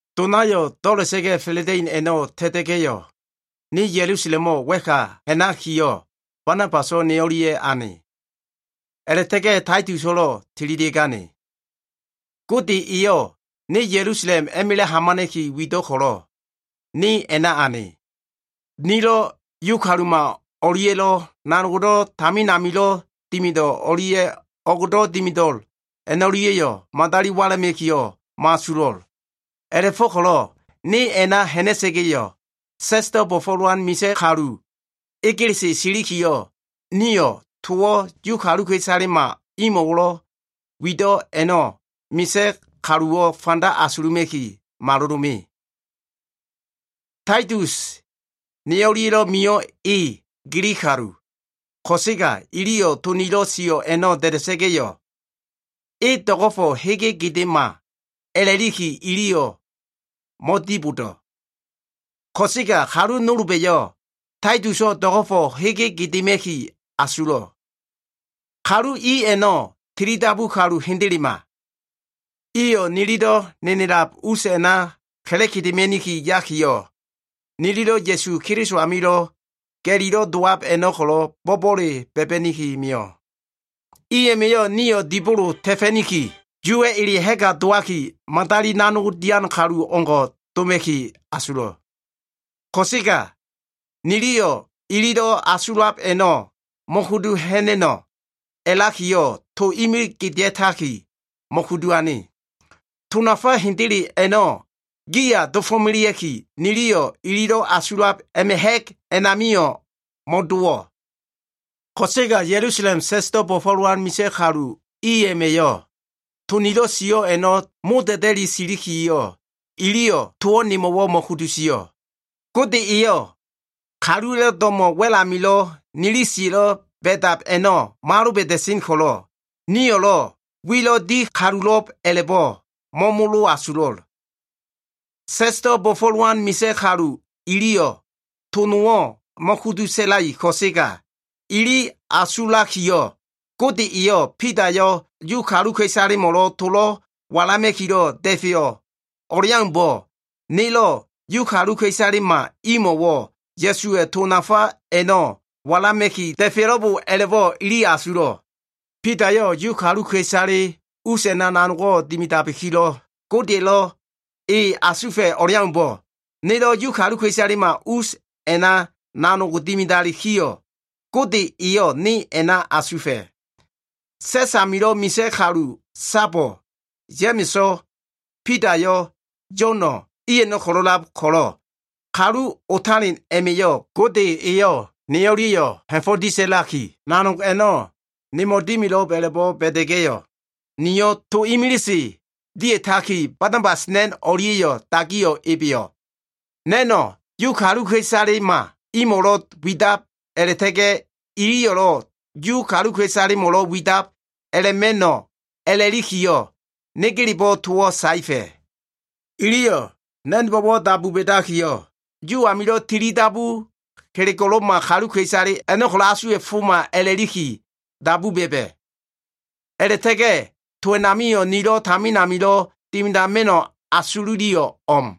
Donayo꞉ do꞉la꞉ta꞉ga꞉ fa꞉la꞉da꞉in a꞉no꞉ ta꞉ta꞉ga꞉yo꞉, ne Ya꞉lusalemo꞉ wa꞉ka ha꞉nakiyo꞉, Banabaso꞉ ne o꞉lia꞉ ane. A꞉la꞉ta꞉ga꞉ Taituso꞉lo꞉ tililia꞉gane. Gode eyo꞉ ne Ya꞉lusalem a꞉ma꞉la꞉ hamana꞉ki wido꞉ ko꞉lo꞉ ne a꞉na ane. Nilo꞉ Yu kaluma o꞉lia꞉lo꞉ nanog tamin amilo꞉ dimido꞉ o꞉lia꞉ o꞉gdo꞉ dimida꞉lo꞉l a꞉no꞉lia꞉yo꞉ madali wala꞉ma꞉kiyo꞉ mo꞉asulo꞉. A꞉la꞉go꞉ko꞉lo꞉ ne a꞉na ha꞉na꞉sa꞉ga꞉yo꞉, sa꞉sdo꞉ bo꞉fo꞉lowan misa꞉ kalu egelese silikiyo꞉, niyo꞉ towo꞉ Yu kaluka꞉isalema imo꞉lo꞉ wido꞉ a꞉no꞉ misa꞉ kaluwo꞉ fanda asuluma꞉ki malolo꞉ me. Taitus ne o꞉lia꞉lo꞉ mio꞉ e Gilig kalu, ko꞉sega iliyo꞉ to nilo꞉ sio꞉ a꞉no꞉ da꞉da꞉sa꞉ga꞉yo꞉, e do꞉go꞉fo꞉ hege gedema a꞉lakiyo꞉ iliyo꞉ mo꞉dibodo꞉. Ko꞉sega kalu nolba꞉yo꞉ Taituso꞉ do꞉go꞉fo꞉ hege gedema꞉ki asulo꞉. Kalu i a꞉no꞉ tilidabu kalu hendelema. Iyo꞉ nililo꞉ nenelab us a꞉na ka꞉la꞉gedema꞉ni yakiyo꞉, nililo꞉ Ya꞉su Keliso amilo꞉ ga꞉lilo꞉ dowab a꞉no꞉ ko꞉lo꞉, bo꞉bo꞉le ba꞉ba꞉ni mio꞉. I a꞉ma꞉yo꞉ nio꞉ dibolo ta꞉fa꞉niki, Yuwa꞉ ele ha꞉ga dowaki, madali nanogdo꞉ dian kalu o꞉ngo꞉ doma꞉ki asulo꞉. Ko꞉sega niliyo꞉ ililo꞉ asulab a꞉no꞉ mo꞉kudu ha꞉na꞉no꞉ a꞉lakiyo꞉, to imilig gedea꞉taki, mo꞉kudu ane. To nafa hendele a꞉no꞉ giya dofo꞉melea꞉kiyo꞉, niliyo꞉ ililo꞉ asulab a꞉ma꞉ ha꞉g amio꞉ mo꞉dowo꞉. Ko꞉sega Ya꞉lusalem sa꞉sdo꞉ bo꞉fo꞉lowan misa꞉ kalu i a꞉ma꞉yo꞉lo꞉ to nilo꞉ sio꞉ a꞉no꞉ moda꞉da꞉li silikiyo꞉, iliyo꞉ towo꞉ nemo꞉wo꞉ mo꞉kudu sio꞉. Gode eyo꞉ kaluwa꞉lo꞉ do꞉mo꞉ wa꞉l wenamilo꞉ nili siya꞉lo꞉ ba꞉dab a꞉no꞉ mo꞉aloba꞉da꞉sen ko꞉lo꞉, niyo꞉lo꞉ wilo꞉ di kalulo꞉b a꞉la꞉bo꞉ mo꞉molo asulo꞉l. Sa꞉sdo꞉ bo꞉fo꞉lowan misa꞉ kalu iliyo꞉ to nowo꞉ mo꞉kudu sa꞉lai ko꞉sega, ili asulakiyo꞉, Gode eyo꞉ Bidayo꞉ Yu kaluka꞉isalemo꞉lo꞉ to walama꞉kilo꞉ da꞉feyo꞉ o꞉leaumbo꞉, nelo꞉ Yu kaluka꞉isalema imo꞉wo꞉ Ya꞉suwa꞉ to nafa a꞉no꞉ walama꞉ki da꞉feyo꞉lo꞉b a꞉la꞉bo꞉ iliyo꞉ asulo꞉. Bidayo꞉ Yu kaluka꞉isale us a꞉na nanogdo꞉ dimidabikilo꞉, Godeya꞉lo꞉ e asufa꞉ o꞉leaumbo꞉, nelo꞉ Yu kaluka꞉isalema us a꞉na nanogo꞉ dimida꞉likiyo꞉, Gode eyo꞉ ne a꞉na asufa꞉. Sa꞉s amilo꞉ misa꞉ kalu sabo꞉, Ya꞉ma꞉so꞉, Bidayo꞉, Yo꞉no꞉, i a꞉no꞉ ko꞉lo꞉lab ko꞉lo꞉, kalu otalen a꞉ma꞉yo꞉ Gode eyo꞉ ne o꞉lia꞉yo꞉ ha꞉fo꞉ disa꞉laki, nanog a꞉no꞉ nemo꞉ dimilo꞉b a꞉la꞉bo꞉ ba꞉da꞉ga꞉yo꞉, nio꞉ to imilise dia꞉taki, Banabas na꞉n o꞉lia꞉yo꞉ dagiyo꞉ ebeyo꞉. Na꞉no꞉ Yu kaluka꞉isalema imo꞉wo꞉lo꞉ wida꞉b, a꞉la꞉ta꞉ga꞉ iliyo꞉lo꞉ Yu kaluka꞉isalemo꞉wo꞉lo꞉ wida꞉b a꞉la꞉ma꞉no꞉ a꞉la꞉likiyo꞉, negelebo꞉ towo꞉ saefa꞉. Iliyo꞉ na꞉nbo꞉wo꞉ dabu ba꞉dakiyo꞉, Yu amilo꞉ tilidabu kelego꞉lo꞉ma kaluka꞉isale a꞉no꞉ ko꞉lo꞉ asuwa꞉foma a꞉la꞉liki dabu ba꞉ba꞉. A꞉la꞉ta꞉ga꞉ to a꞉namio꞉ nilo꞉ tamin amilo꞉ dimidama꞉no꞉ asululiyo꞉ o꞉m.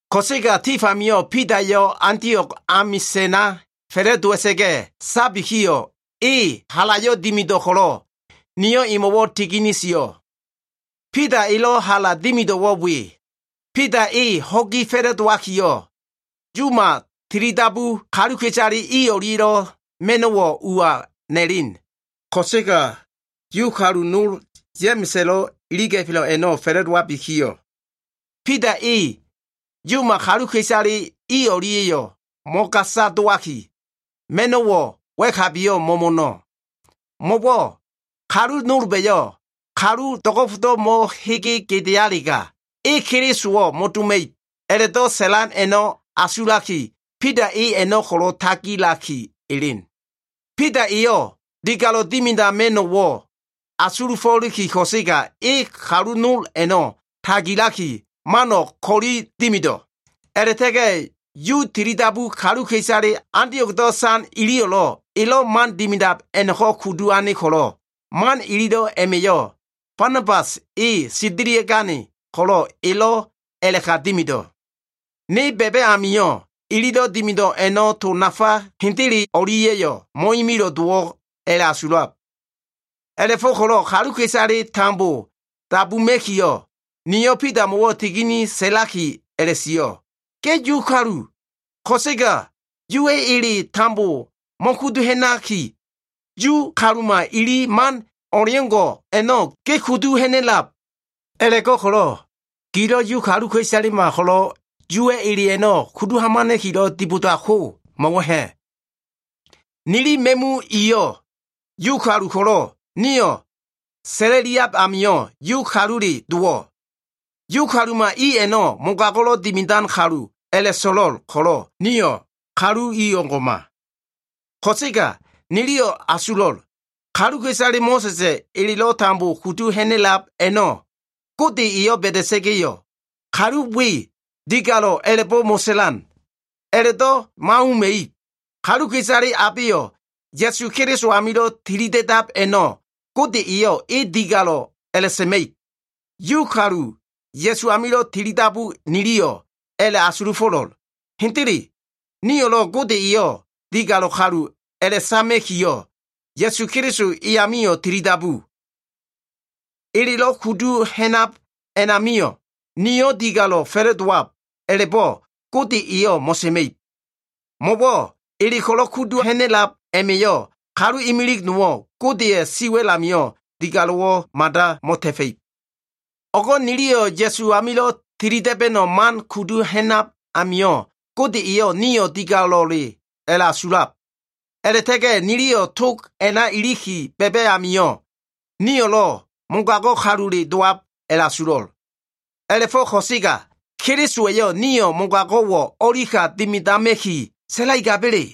Ko꞉sega tif amio꞉, Bidayo꞉ Antio꞉g amisa꞉na fa꞉la꞉dowa꞉sa꞉ga꞉ sabikiyo꞉, e halayo꞉ dimido꞉ ko꞉lo꞉, niyo꞉ emo꞉wo꞉ tigini sio꞉. Bida elo꞉ hala dimido꞉wo꞉ we. Bida e ho꞉gi fa꞉la꞉dowakiyo꞉, Yuma tilidabu kaluka꞉isale i o꞉lia꞉yo꞉ ma꞉no꞉wo꞉ uwa na꞉len. Ko꞉sega Yu kalu nol, Ya꞉ma꞉sa꞉lo꞉ iliga꞉fo꞉ a꞉no꞉ fa꞉la꞉dowabikiyo꞉, Bida e Yuma kaluka꞉isale i o꞉lia꞉yo꞉ mo꞉gasa dowaki, ma꞉no꞉wo꞉ wa꞉kabiyo꞉ mo꞉mo꞉no꞉. Mo꞉wo꞉ kalu nolba꞉lo꞉ “kalu do꞉go꞉fo꞉ mo꞉hege gedealega, e Kelisowo꞉ mo꞉doma꞉ib” a꞉la꞉do꞉ sa꞉lan a꞉no꞉ asulaki, Bida e a꞉no꞉ ko꞉lo꞉ tagilaki elen. Bida eyo꞉ digalo꞉ dimidama꞉no꞉wo꞉ asulufo꞉liki ko꞉sega, e kalu nol a꞉no꞉ tagilaki, mano꞉ ko꞉li dimido꞉. A꞉la꞉ta꞉ga꞉ Yu tilidabu kaluka꞉isale Antio꞉gdo꞉ san iliyo꞉lo꞉ elo꞉ man dimidab a꞉no꞉ko꞉ kudu ane ko꞉lo꞉, man ililo꞉ a꞉ma꞉yo꞉ Banabas e sendelia꞉gane ko꞉lo꞉ elo꞉ a꞉la꞉ka dimido꞉. Ne ba꞉ba꞉ amio꞉ ililo꞉ dimido꞉ a꞉no꞉ to nafa hendele o꞉lia꞉yo꞉ mo꞉imilo꞉ dowo꞉ a꞉la꞉asulab. A꞉la꞉fo꞉ko꞉lo꞉ kaluka꞉isale tambo dabuma꞉kiyo꞉, niyo꞉ Bidamo꞉wo꞉ tigini sa꞉laki a꞉la꞉sio꞉, “Ge Yu kalu, ko꞉sega Yuwa꞉ eleyo꞉ tambo mo꞉kudu ha꞉naki, Yu kaluma ili man o꞉leo꞉ngo꞉ a꞉no꞉ ge kudu ha꞉na꞉lab. A꞉la꞉go꞉ko꞉lo꞉ gilo꞉ Yu kaluka꞉isalema ko꞉lo꞉ Yuwa꞉ ele a꞉no꞉ kudu hamana꞉kilo꞉ dibodab ko, mo꞉wo꞉ ha꞉? “Nili ma꞉mu iyo꞉ Yu kalu ko꞉lo꞉, nio꞉ sa꞉la꞉liab amio꞉ Yu kalule dowo꞉. Yu kaluma i a꞉no꞉ mogago꞉lo꞉ dimidan kalu a꞉la꞉so꞉lo꞉l ko꞉lo꞉, nio꞉ kalu i o꞉ngo꞉ma. Ko꞉sega niliyo꞉ a꞉la꞉asulo꞉l. Kaluka꞉isale Mo꞉sa꞉sa꞉ elelo꞉ tambo kudu ha꞉na꞉lab a꞉no꞉, Gode eyo꞉ ba꞉da꞉sa꞉ga꞉yo꞉, kalu we digalo꞉ a꞉la꞉bo꞉ mo꞉sa꞉lan. A꞉la꞉do꞉ mo꞉auma꞉ib. Kaluka꞉isale abeyo꞉ Ya꞉su Keliso amilo꞉ tilida꞉dab a꞉no꞉, Gode eyo꞉ e digalo꞉ a꞉la꞉sa꞉ma꞉ib. Yu kalu, Ya꞉su amilo꞉ tilidabu niliyo꞉ a꞉la꞉ asulufo꞉lo꞉l. Hendele nio꞉lo꞉ Gode eyo꞉ digalo꞉ kalu a꞉la꞉sama꞉kiyo꞉, Ya꞉su Keliso e amio꞉ tilidabu. Elelo꞉ kudu ha꞉nab a꞉namio꞉ nio꞉ digalo꞉ fa꞉la꞉dowab a꞉la꞉bo꞉ Gode eyo꞉ mo꞉sa꞉ma꞉ib. Mo꞉wo꞉ ele ko꞉lo꞉ kudu ha꞉na꞉lab a꞉ma꞉yo꞉ kalu imilig nowo꞉ Godeya꞉ siwa꞉l amio꞉ digalo꞉wo꞉ mada mo꞉ta꞉fa꞉ib. “O꞉go꞉ niliyo꞉ Ya꞉su amilo꞉ tilida꞉ba꞉no꞉ man kudu ha꞉nab a꞉namio꞉ Gode eyo꞉ nio꞉ digalo꞉le a꞉la꞉asulab. A꞉la꞉ta꞉ga꞉ niliyo꞉ tog a꞉na iliki ba꞉ba꞉ amio꞉, nio꞉lo꞉ mogago꞉ kalule dowab a꞉la꞉asulo꞉. A꞉la꞉fo꞉ ko꞉sega Kelisowa꞉yo꞉ nio꞉ mogago꞉wo꞉ o꞉li ka dimidama꞉ki sa꞉laigaba꞉le?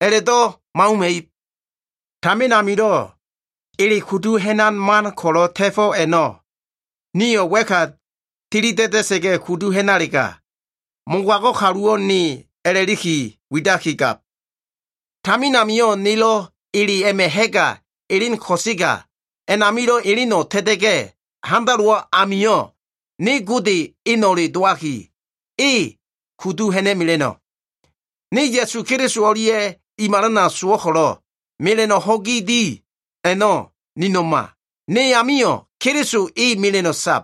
A꞉la꞉do꞉ mo꞉auma꞉ib! Tamin amilo꞉ ele kudu ha꞉nan man ko꞉lo꞉ ta꞉fo꞉ a꞉no꞉ niyo꞉ wa꞉ka a꞉tili da꞉da꞉sa꞉ga꞉ kudu ha꞉nalega, mogago꞉ kaluwo꞉ ne, a꞉la꞉liki widakigab. Tamin amio꞉ nelo꞉ ele a꞉ma꞉ ha꞉ga elen ko꞉sega a꞉namilo꞉ eleno꞉ ta꞉ta꞉ga꞉ handalowo꞉ amio꞉, ne Gode eno꞉le dowaki, e kudu ha꞉na꞉mela꞉no꞉. Ne Ya꞉su Keliso o꞉lia꞉ i malana sowo꞉ ko꞉lo꞉, mela꞉no꞉ ho꞉gi di a꞉no꞉ nino꞉ma. Ne amio꞉ Keliso e mela꞉no꞉ sab.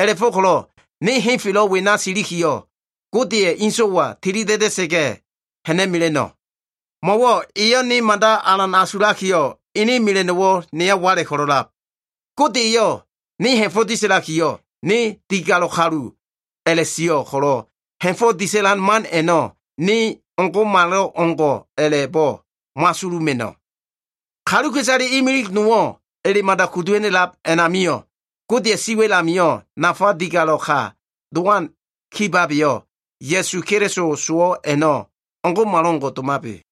A꞉la꞉fo꞉ko꞉lo꞉ ne henfelo꞉ wena silikiyo꞉, Godeya꞉ ene So꞉waya tilida꞉da꞉sa꞉ga꞉ ha꞉na꞉mela꞉no꞉. Mo꞉wo꞉ eyo꞉ ne mada alan asulakiyo꞉ ene mela꞉no꞉wo꞉ neya wala꞉ ko꞉lo꞉lab. Gode eyo꞉ ne ha꞉fo꞉ disa꞉lakiyo꞉, ne digalo꞉ kalu a꞉la꞉sio꞉ ko꞉lo꞉, ha꞉fo꞉ disa꞉lan man a꞉no꞉ ne o꞉ngo꞉malo꞉ngo꞉ a꞉la꞉bo꞉ mo꞉asuluma꞉no꞉. Kaluka꞉isale imilig nowo꞉ ele mada kudu ha꞉na꞉lab a꞉namio꞉, Godeya꞉ siwa꞉l amio꞉ nafa digalo꞉ ka dowan kibabeyo꞉, Ya꞉su Keliso sowo꞉ a꞉no꞉ o꞉ngo꞉malo꞉ngo꞉ domabe.”